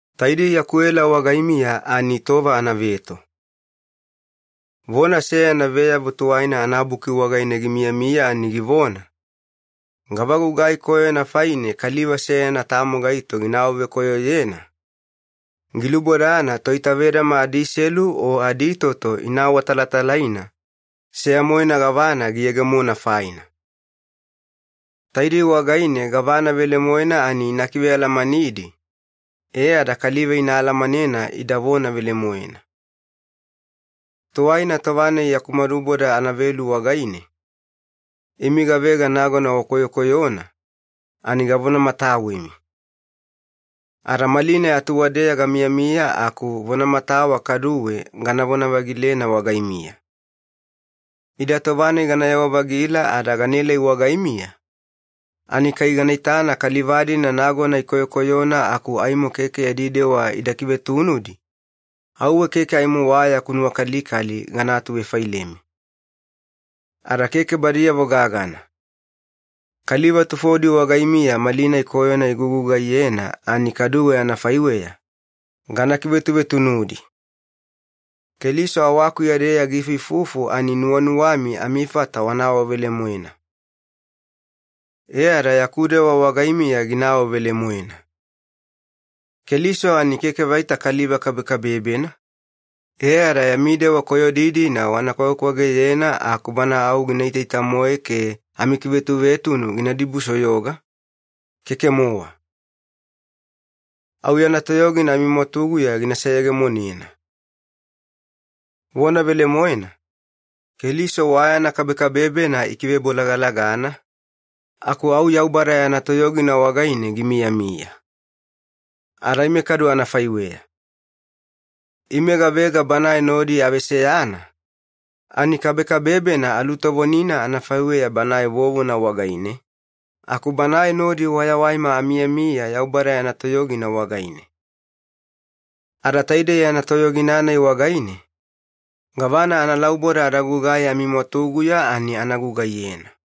Taidei yaku ela wagaimiya ani tova anaveto. Vona seyana Veyavo Tuwaina anaBuki wagaine gimiyamiya ani givona, “Gava gugai koyona faine kaliva seyana tamo gaito gina awavekoyoyena, gilubodana toitavedama adiselu o aditoto ina awatalatalaina seya-moena gavana giyegemona faina. Taidei wagaine gavana velemoena ani ina kivealamanidi, e ada kaliva ina alamanena ida vona velemoena.” Tuwaina tova-nai yaku maduboda anavelu wagaine, imi gavega nagona wakoyokoyona, ani gavonamatawemi. Ada malinai atuwadeya gamiyamiya aku vonamatawa kaduwe ganavona-vagilena wagaimiya. Ida tova-nai ganayewa-vagila ada ganaelai wagaimiya, ani kai gana itana kaliva-dina nagona ikoyokoyona aku aimo keke yadi dewa ida kivetunudi, auwe keke aimo wa yaku nuwakalikali gana atuvefailemi. Ada keke badiyavo gagana. Kaliva tufodi wagaimiya malinai koyona igugugaiyena ani kaduwe anafaiweya, gana kivetuvetunudi. Keliso awakuya-deya giifuifufu ani nuwanuwami amifata wana awavelemoena. E ada yaku dewa wagaimiya gina awavelemoena. Keliso ani keke vaita kaliva kabekabebena, e ada yami dewa koyodi-dina wana kwagekwageyena aku Bana au gina itaita-moe ke amikivetuvetunu gina dibusoyoga, keke-mowa. Au yana toyogina amimwatuguya gina seyegemonena. Vona velemoena, Keliso wa yana kabekabebena ikivebolagalagana, aku au Yaubada yana toyogina wagaine gimiyamiya. Ada ime kadu anafaiweya. Ime gavega Banae nodi aveseyana, ani kabekabebena alutovonina anafaiweya Banae vovona wagaine, aku Banae nodi wayawaima amiyamiya Yaubada yana toyogina wagaine. Ada taidei yana toyogina-nai wagaine, gavana analauboda ada gugai amimwatuguya ani ana gugaiyena.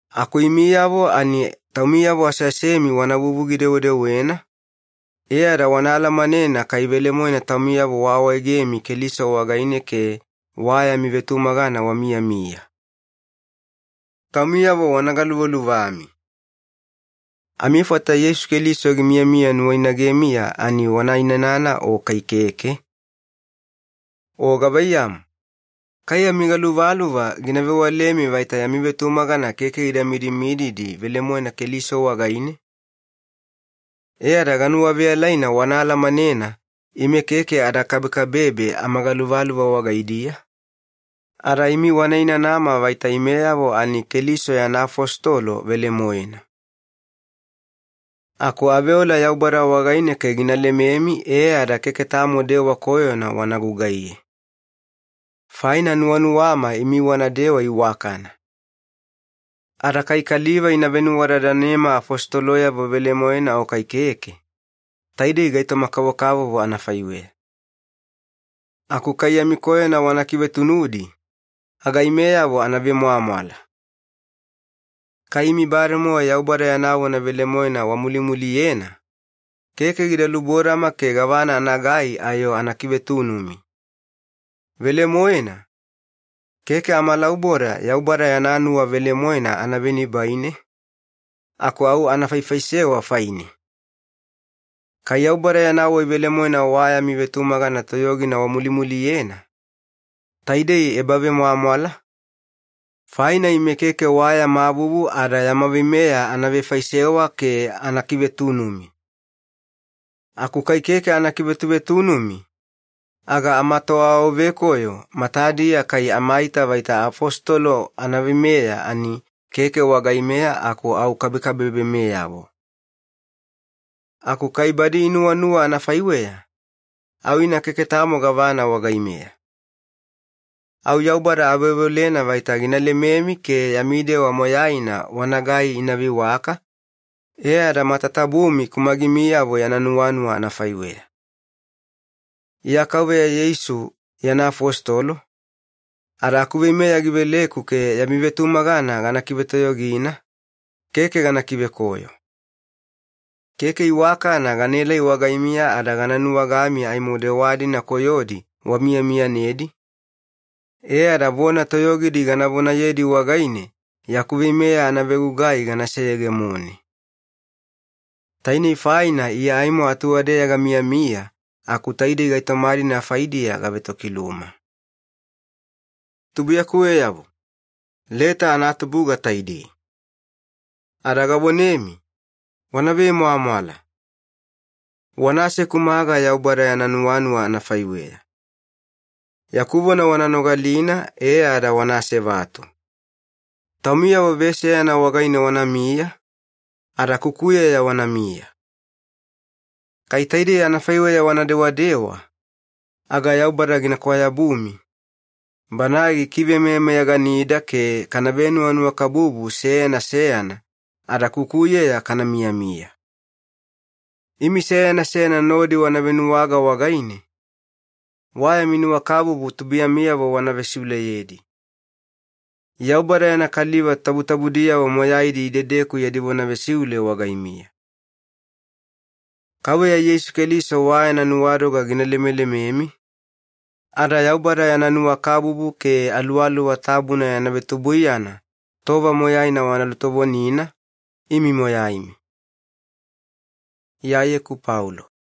Aku imiyavo ani taumiyavo aseasemi wana vuvugi-dewedewena, e ada wana alamanena kai velemoena taumiyavo waawaegemi Keliso wagaine ke wa yami vetumagana wamiyamiya. Taumiyavo wana galuvaluvami. Amifata Yeisu Keliso gimiyamiya nuwainagemiya ani wana inanana o kai keke? O gavaiyamu, kai amigaluvaluva gina vewalemi vaita yami vetumagana keke gida midimididi velemoena Keliso wagaine? E ada ganuwaveyalaina wana alamanena ime keke ada kabebe amagaluvaluva wagaidiya, ada imi wana inanama vaita imeyavo ani Keliso yana afositolo velemoena. Aku aveola Yaubada wagaine ke gina lememi e ada keke tamo dewa koyona wana gugaiye. Faina nuwanuwama imi wanadewa iwakana. Ada kai kaliva ina venuwadadanema afositoloyavo velemoena o kai keke, taidei gaitoma-kavokavovo anafaiweya. Aku kai yami koyona wana kivetunudi, aga imeyavo ana vemwamwala. Kai imi bademowa Yaubada yana vona velemoena wamulimuliyena, keke gida lubodama ke gavana anagai ayo ana kivetunumi. Velemoena, keke amalauboda Yaubada yana nuwa velemoena ana venibaine, aku au ana faifaisewa faine. Kai Yaubada yana wai velemoena wa yami vetumagana toyogina wamulimuliyena, taidei ebavemwamwala, faina ime keke wa yama vuvu ada yama veimeya ana vefaisewa ke ana kivetunumi. Aku kai keke ana kivetuvetunumi, aga amatoawavekoyo matadiya kai amaita vaita afositolo anaveimeya ani keke wagaimeya aku au kabekabebemeyavo. Aku kai badi inuwanuwa anafaiweya, au ina keke tamo gavana wagaimeya. Au Yaubada aveoveolena vaita gina lememi ke yami dewa moyaina wanagai ina veiwaka, e ada matatabumi kumagimiyavo yana nuwanuwa anafaiweya. Iya Kauveya Yeisu yana afositolo, ada akuveimeya giveleku ke yami vetumagana gana kivetoyogina, keke gana kivekoyo. Keke iwakana ganaelai wagaimiya ada gana nuwagami aimo dewa-dina koyodi wamiyamiyanedi, e ada vona toyogidi gana vonayedi wagaine yaku veimeya anavegugai gana seyegemone. Tainei faina Iya aimo atuwadeya gamiyamiya aku taidei gaitoma-dina faidiya gavetokiluma. Tubuiyakuweyavo, leta anatubuga taidei. Ada gavonemi, wana vemwamwala! Wana asekumaga Yaubada yana nuwanuwa anafaiweya. Yaku vona wana nogalina e ada wana asevatu. Taumiyavo veseyana wagaine wanamiya, ada kukuyeya wanamiya. Kai taidei anafaiweya wana dewadewa, aga Yaubada gina kwayabumi, Banae gikivemeyameyaganida ke kana venuwanuwakabubu seyana seyana ada kukuyeya kana miyamiya. Imi seyana seyana nodi wana venuwaga wagaine, wa yami nuwakabubu tubuiyamiyavo wana vesiuleyedi. Yaubada yana kaliva tabutabudiyavo moyaidi idedeku yadi vona vesiule wagaimiya. Kauveya Yeisu Keliso wa yana nuwadoga gina lemelememi, ada Yaubada yana nuwakabubu ke Aluwaluwa Tabuna yana vetubuiyana tova moyaina wana lutovonina, imi moyaimi. Iyayeku Paulo